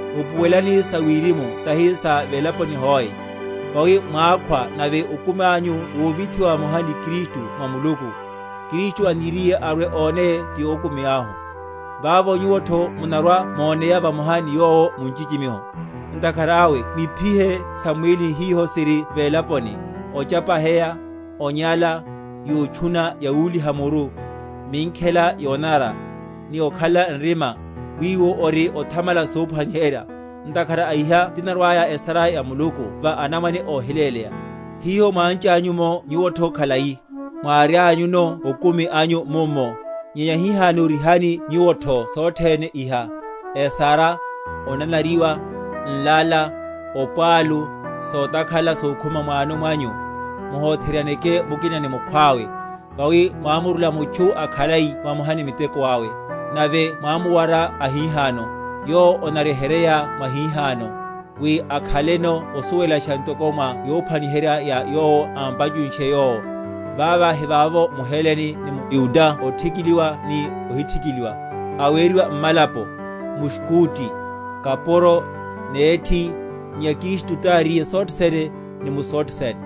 Upuwelelani sa wirimu tahi sa velaponi hoe. Vawi mwákhwa, nave okumi anyu wovithiwa vamoha ni Kristu mwa Muluku. Kristu aniriye arwe‐oneye, ti okumi ahu, vavo nyuwotho munarwa‐moneya vamoha ni Yowo mu nchichimiho. Ntakhara awe mwiphihe sam’mwílini hiho siri velaponi; ochapaheya, onyala, yotchuna yawuliha muru, minkhela yonanara, ni okhalela nrima, wiwo ori othamala sophwaniherya; ntakhara a iha tinarwaya esara ya Muluku va anamwane óhiléleya; hiho mwánchanyu’mo nyuwotho khalai, mwárianyuno okumi anyu mummo. Nyenya hihano rihani nyuwotho sothene iha: esara, onanariwa, nlala, opwalu, sotakhala sokhuma mwano mwanyu: muhotheryaneke mukina ni mukhwawe; vawi mwámurula mutchu akhalai vamoha ni miteko awe, nave mwámuwara ahihano, yowo onaryeheryeya mwahihano, wi akhaleno osuwelasha, ntoko mwa yophwaniherya ya Yowo ámpachunshe Yowo; Vava hivavovo mHelene ni mYuda othikiliwa ni ohithikiliwa, aweriwa mmalapo, mSkuti, kapuro, nethi, nyenya Kristu tari sothe sene, ni mu sothe sene.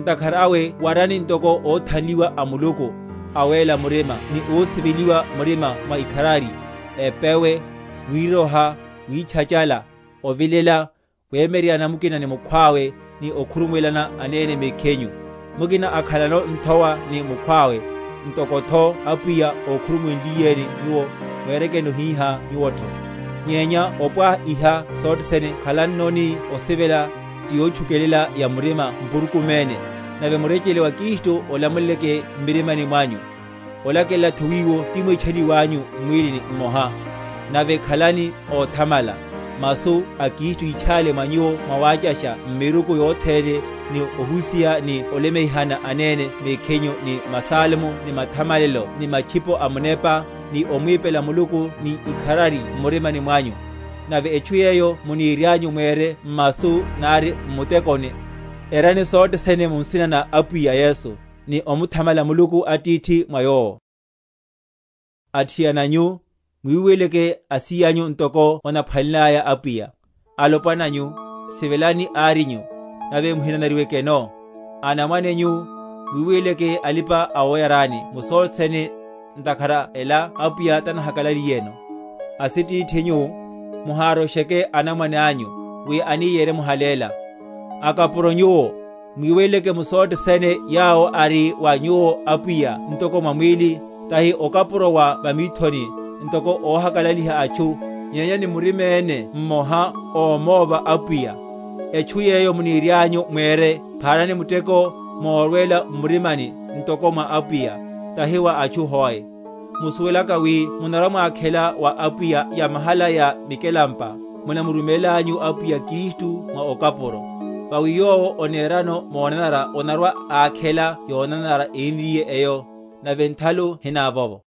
Ntakhara awe warani, ntoko óthanliwa a Muluku, awéla murima ni ósiveliwa, murima wa ikharari, epewe, wiroha, witchachala, ovilela; wemyeryeryana mukina ni mukhwawe, ni okhurumuwelana anene mekhinyu, mukina ákhanleno nthowa ni mukhwawe; ntokotho Apwiya ókhurumuwenliyeni nyuwo, mwerekeno hihá nyuwotho; nyenya opwaha iha sothene khalannoni osivela, ti yotchukelela ya murima mpurukuméne. Nave murechele wa Kristu olamuleleke m’mirima mwanyu, olakelelatho wiwo timwítchaniwanyu m’mwílini mmoha; nave khalani óthamala. Masu a Kristu yitchále mwa nyuwo mwawáchasha m’miruku yothene, ni ohusiha ni olemeihana anene mekhinyu ni masalmo ni mathamalelo ni matchipo a munepa, ni omwipela Muluku ni ikharari m’murimani mwanyu. Nave etchu yeyo munirianyu mwere m’masu nari m’mutekoni, erani sothe sene mu nsina na Apwiya Yesu, ni omuthamala Muluku Atithi mwa Yowo. Sa mwimusi ya mutchu. Athiana nyu, muwiweleleke asíyanyu, ntoko onaphwanelelaya Apwiya. Alopwana nyu, sivelani árinyu, nave muhinanariwekeno. Anamwane nyu, muwiweleleke alipa‐awoyarani mu sothe sene, ntakhara ela Apwiya tanahakalaliyeno. Asitithi nyu, muharosheke anamwane anyu, wi ani yeremuhaléla. Akapuro nyuwo, mwiweleleke mu sothe sene yawo ari wa nyuwo apwiya ntoko mwa mwíli, tahi okapuro wa va mithoni, ntoko óhakalaliha atchu, nyenya ni muriméne mmoha, ómova Apwiya; etchu yeyo munirianyu mwere, pharani muteko morwela m’murimani, ntoko mwa Apwiya, tahi wa atchu hoe: musuwelaka wi munarwa‐mwakhela wa Apwiya yamahala ya mikelampa; munamurumélanyu Apwiya Kristu mwa okapuro. Vawi yowo onerano monanara onarwa‐akhela yonanara énriye’yo; nave nthalu hinavovo.